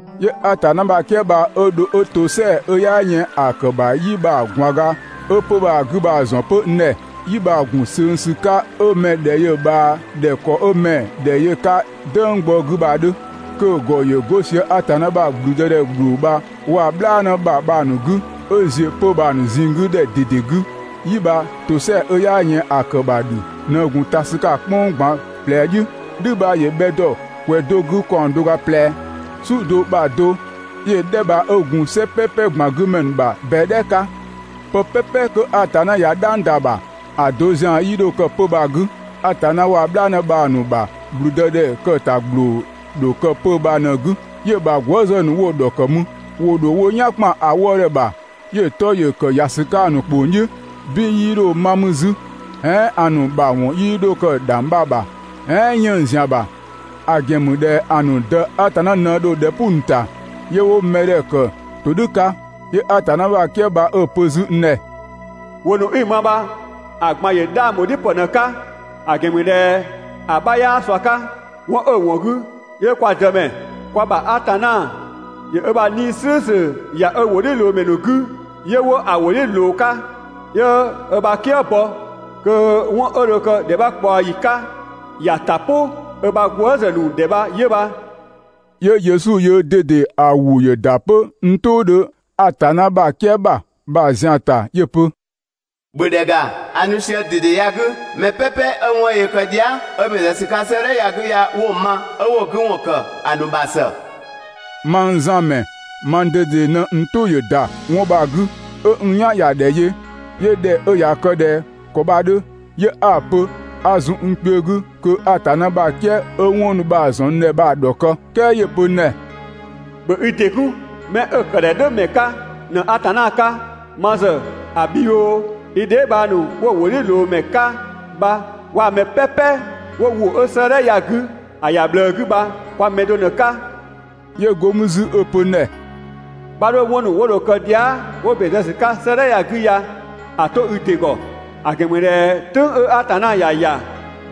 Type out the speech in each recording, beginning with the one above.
'Yö Atanna ‑bha "kië bha 'ö dho 'ö ‑tosɛa 'ö 'yaa yën ‑a ‑kë ‑bha "yi bha‑ ꞊gwaan ga 'ö 'pö‑ ‑bha 'gü bha‑ ‑zɔn 'pö n ‑dhɛ. "Yi bha‑ ‑gun ꞊söng ‑sü 'ka 'ö mɛ‑ ‑dhɛ yö‑ ꞊bhaa ꞊dhɛ ‑kɔ 'ö 'mɛ‑ ‑dhɛ yö‑ 'ka "dënggbɔ 'gü bha‑ 'dhö, kö‑ ‑gɔ ‑yö 'go sië Atanna ‑bha ‑blüdëdhɛ ‑gbloo bha waa‑ "bhlaanë ‑bha bha‑ ‑nu 'gü 'ö ‑ziö 'pö‑ bha‑ ꞊zinng 'gü ‑dhɛ ꞊dede 'gü. "yi bha ‑tosɛa 'ö 'yaa yën ‑a ‑kë ‑bha "dhü ꞊në gun ta ‑sü 'ka‑ "kpʋng ꞊gban ꞊plɛ "dhiʋ̈. "Dhü bha ‑yö bhɛ ‑dɔ ‑kwɛ do 'gü ‑kaɔng do ga ꞊plɛ, "su do ‑bha do. 'Yö‑ "dhɛ bha 'ö gun "sɛ "pɛpɛ ꞊gban 'gü ‑mɛ ‑nu ‑bha ꞊bɛdhɛ 'ka. Pë "pɛpɛ kö Atanna ꞊ya "dhang ‑da ‑bha, ‑a do ‑zian 'yii 'dho kë 'pö‑ bha‑ 'gü. Atanna waa‑ "bhlaanë bha‑ ‑nu ‑bha ‑gblüdëdhɛ ‑kë ‑ta ‑gbloo ‑dho kë 'pö‑ bha ꞊në‑ 'gü, 'yö‑ ‑bha gwëëzë ‑nu 'wo‑ ‑dhɔkë mü. ‑Wo ‑dho wo "yan ‑kpan ‑a wëëdhɛ bha, 'yö‑ 'tɔ ‑yö ‑kë ‑ya ‑sü 'ka‑ ‑nu ‑kpong "dhiʋ̈. "Bin 'yii 'dho 'ma 'zü, "ɛɛn ‑a ‑nu ‑bha ‑wɔn 'yii 'dho kë ‑dhangbha ‑bha, "ɛɛn 'yënng‑ ‑zian ‑bha, ‑a ‑gɛn ‑mü ꞊dhɛ ‑a ‑nu Dë Atanna ꞊në dho ‑dhɛ "pʋ‑ ‑nu ‑ta, 'yö 'wo mɛdhɛ ‑kë ‑todhʋ̈ 'ka. 'Yö Atanna ‑bha "kië bha 'ö‑ pö 'zü n ‑dhɛ: «‑Wʋ ‑nu 'i‑ ma bha‑ ꞊gban ‑yö 'dhang ‑bho "dhiʋ̈ ‑pë ꞊në‑ 'ka, ‑a ‑gɛn ‑mü ꞊dhɛ ‑a 'bha 'yaa ꞊sua 'ka. 'Wɔn 'ö‑ ‑wɔn 'gü 'yö kwa Dëmɛ, kwa ‑bha Atanna ‑yö ö ‑bha 'Nii‑ "slʋ̈ʋ̈slʋ̈ ‑ya ö ‑wʋdhiʋ̈loomɛ ‑nu 'gü 'yö 'wo‑ ‑wʋ "dhiʋ̈ ꞊loo‑ 'ka, 'yö ö ‑bha "kië bɔ kö 'wɔn 'ö dho kë ‑dhɛ 'bha ꞊kpaɔ ‑yi 'ka ‑ya ‑ta "pʋ 'ö ‑bha gwëëzë ‑nu ‑dhɛ bha 'yö bha.» 'Yö Yesu yöö ꞊dede ‑a ‑wʋ ‑yö ‑da 'pö n "tʋʋdhö Atanna ‑bha "kië ‑bha bha‑ ‑zian ‑ta 'yö‑ pö: «‑Bhö ‑dhɛ ‑ga, a nu sië ‑dede ya‑ 'gü. Mɛ "pɛpɛ 'ö 'wɔn 'ö yöö kë dhia", 'ö ‑bɛn zë ‑sü 'ka 'sëëdhɛ ya‑ 'gü ya 'wo‑ ma, 'ö 'wo‑ 'gü ‑wɔn ‑kë ‑a ‑nu ‑bha ‑së!» Mang Zan ‑mɛ mang ꞊dede ꞊në n "tʋ ‑yö ‑da 'wɔn bha‑ 'gü, 'ö n "yan ‑ya ‑dhɛ yö. 'Yö ꞊dhɛ 'ö ꞊ya kë ꞊dhɛ ‑kɔ bha‑ 'dhö, 'yö 'a‑ pö 'a zun n kpiö 'gü kö Atanna ‑bha "kië 'ö 'wɔn ‑nu bha‑ ‑zɔn n ‑dhɛ bha‑ ‑dhɔkë. "Kɛɛ 'yö‑ pö n ‑dhɛ: «‑Bhö i ‑dɩ 'kun! 'Mɛ 'ö‑ ‑kë ‑dhɛ "dhʋ̈ ‑mɛ 'ka ꞊në Atanna 'ka. Ma ‑zë ‑a bhi oo, i dheebhang ‑nu 'wo‑ ‑wʋdhiʋ̈loomɛ 'ka bha waa‑ mɛ "pɛpɛ 'wo ‑wʋ 'ö 'sëëdhɛ ya‑ 'gü ya‑ ꞊bhlëë ‑ya bha kwa mɛ do ꞊në‑ 'ka.» 'Yö go mü 'zü 'ö‑ pö n ‑dhɛ: «'Bha 'dho 'wɔn ‑nu 'wo dho kë dhia" 'wo ‑bɛn zë ‑sü 'ka 'sëëdhɛ ya‑ 'gü ya‑ 'to i ‑dɩ ‑gɔ. ‑A ‑gɛn ‑mü ꞊dhɛ "tʋ̈ng 'ö Atanna ‑ya ‑ya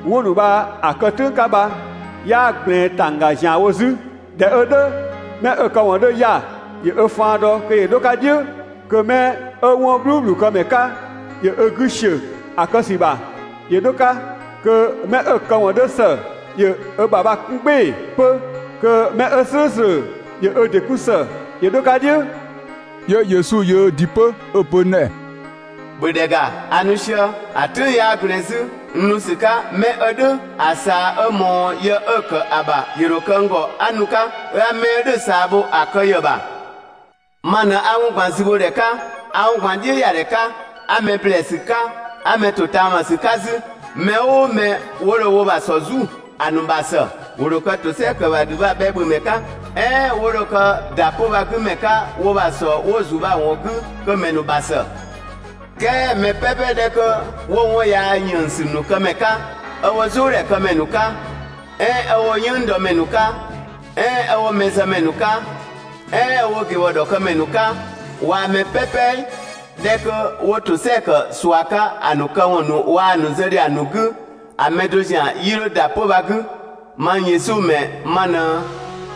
'wɔn ‑nu bha‑ kë "tʋ̈ng 'ka bha 'yaa ꞊gblɛɛn ‑tangga ‑zianwo 'zü. ꞊Dhɛ 'ö "dhʋ̈, 'mɛ 'ö‑ këwɔn 'dhö 'ya‑, ‑yö ö faan dɔ kö ‑yö 'dho‑ 'ka "dhiʋ̈, kö 'mɛ 'ö 'wɔn "bhluubhlu këmɛ 'ka ‑yö ö 'gü ‑siö kë ‑sü ‑bha ‑yö 'dho‑ 'ka. Kö 'mɛ 'ö‑ këwɔn 'dhö ‑së ‑yö ö ‑bha bha‑ 'kun "gbɩɩ‑ 'pö, kö 'mɛ 'ö "slʋ̈ʋ̈slʋ̈ ‑yö ö ‑dɩ 'kun ‑së ‑yö 'dho‑ 'ka "dhiʋ̈.» 'Yö Yesu yöö ‑dɩ 'pö 'ö‑ pö n ‑dhɛ: «‑Bhö ‑dhɛ ‑ga, a nu sië, ‑a "tʋ̈ng 'yaa ꞊gblɛɛn 'zü, n nu ‑sü 'ka 'mɛ 'ö "dhʋ̈‑ ꞊saa 'ö ꞊mɔɔ yë 'ö‑ ‑kë ‑a ‑bha ‑yö ‑dho kë n ‑gɔ 'a nu‑ 'ka, 'ö 'a 'mɛ 'ö "dhʋ̈‑ ꞊saa bho‑ kë ‑yë ‑bha. Ma ꞊në 'a 'wɔn ꞊gban zübhodhɛ 'ka, 'a 'wɔn ꞊gban "dhiʋ̈yadhɛ 'ka, 'a mɛ ‑blɛɛsü 'ka, 'a mɛ ‑totaamasü 'ka 'zü. Mɛ "ʋʋ 'mɛ 'wo dho wo ‑bha ‑sɔ "zu, ‑a ‑nu ‑bha ‑së, ‑wo ‑dho kë ‑tosɛa ‑kë ‑bha ‑dhü bha‑ bhɛ ‑bhö ‑mɛ 'ka, "ɛɛn 'ö 'wo dho kë ‑da 'pö‑ bha‑ 'gü ‑mɛ 'ka wo ‑bha ‑sɔ 'wo‑ ‑zu bha‑ ‑wɔn 'gü, kö‑ ‑mɛ ‑nu ‑bha ‑së. "Kɛɛ mɛ "pɛpɛ 'dhɛ 'kö 'wo 'wɔn yaa ‑yënngsü ‑nu këmɛ 'ka, 'ö 'wo "zʋʋdhɛkëmɛ ‑nu 'ka, "ɛɛn 'ö 'wo "yënngdɔmɛ ‑nu 'ka, "ɛɛn 'ö 'wo mɛzëmɛ ‑nu 'ka, "ɛɛn 'wo ꞊gebhɔ ‑dhɔkëmɛ ‑nu 'ka waa‑ mɛ "pɛpɛ 'dhɛ 'kö 'wo ‑tosɛa ‑kë ꞊sua 'ka ‑a ‑nu këwɔn ‑nu waa‑ ‑nu ‑zë ‑dhiang ‑nu 'gü, ‑a mɛ do zian 'yii 'dho ‑da 'pö‑ bha‑ 'gü! Mang Yesu ‑mɛ ma ꞊në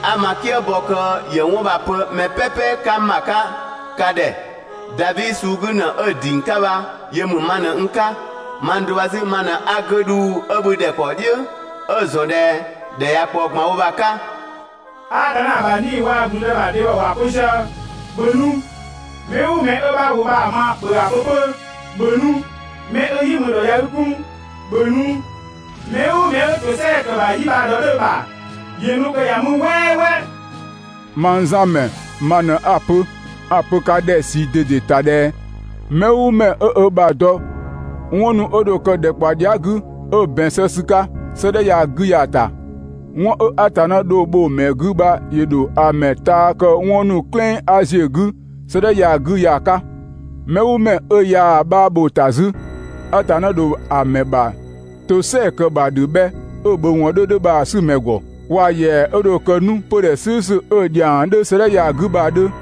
'a ma "kië bɔ kö ‑yö 'wɔn bha‑ pö mɛ "pɛpɛ 'ka n ‑bha 'ka ka ‑dhɛ. Davi suu 'gü ‑në 'ö‑ ‑ding 'ka bha yö ‑mü ma ꞊në n 'ka. Mang do bha 'zü ma ꞊në 'a 'gödhuu 'ö bhü ‑dhɛkpaɔ "dhiʋ̈ 'ö‑ ‑zɔn ꞊dhɛ ‑dhɛ ꞊ya ꞊kpaɔ ꞊gbanwo bha‑ 'ka.» Atanna ‑bha 'Nii‑ waa‑ ‑gblüdë ‑bha dhebhɔ ‑wa pö sië: «‑Bhö nu!» Mɛ "ʋʋ mɛ 'ö 'bha ‑wʋ bha‑ ma ‑bhö ‑a pö 'pö: «‑Bhö nu!» 'Mɛ 'ö "yi mü ‑dhɔ ꞊ya i 'kun, ‑bhö nu, mɛ "ʋʋ mɛ 'ö ‑tosɛa ‑kë ‑bha "yi bha‑ ‑dhɔ 'dhö‑ ‑bha, ‑yö nu kö ‑ya mü "wɛɛwɛɛ! Mang Zan ‑mɛ ma ꞊në 'a‑ pö, 'a‑ pö ka ‑dhɛ ꞊sii ꞊dede ‑ta ꞊dhɛ mɛ "ʋʋ mɛ 'ö ö ‑bha dɔ 'wɔn ‑nu 'ö dho kë ‑dhɛkpaɔ dhia" 'gü 'ö ‑bɛn zë ‑sü 'ka 'sëëdhɛ ya‑ 'gü ya‑ ‑ta, 'wɔn 'ö Atanna dho‑ bho‑ ‑mɛ 'gü bha ‑yö ‑dho ‑a ‑mɛ taa kë 'wɔn ‑nu "klɩng 'a ‑ziö 'gü 'sëëdhɛ ya‑ 'gü ya‑ 'ka. Mɛ "ʋʋ mɛ 'ö ꞊yaa‑ 'bha ‑bho ‑ta 'zü, Atanna ‑dho ‑a ‑mɛ ‑bha ‑tosɛa ‑kë ‑bha ‑dhü bhɛ 'ö‑ ‑bhö ‑wɔn 'dhö 'dhö bha‑ 'sü‑ ‑mɛ ‑gɔ, waa‑ ‑yɛa 'ö dho kë 'nu 'pödhɛ "slʋ̈ʋ̈slʋ̈ 'ö‑ ‑dhiang 'dhö 'sëëdhɛ ya‑ 'gü bha‑ 'dhö.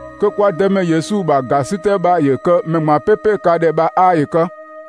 Kö kwa Dëmɛ Yesu ‑bha ‑gasitɛ bha ‑yö kë mɛ ꞊gban "pɛpɛ ka ‑dhɛ bha 'aa ‑yö kë!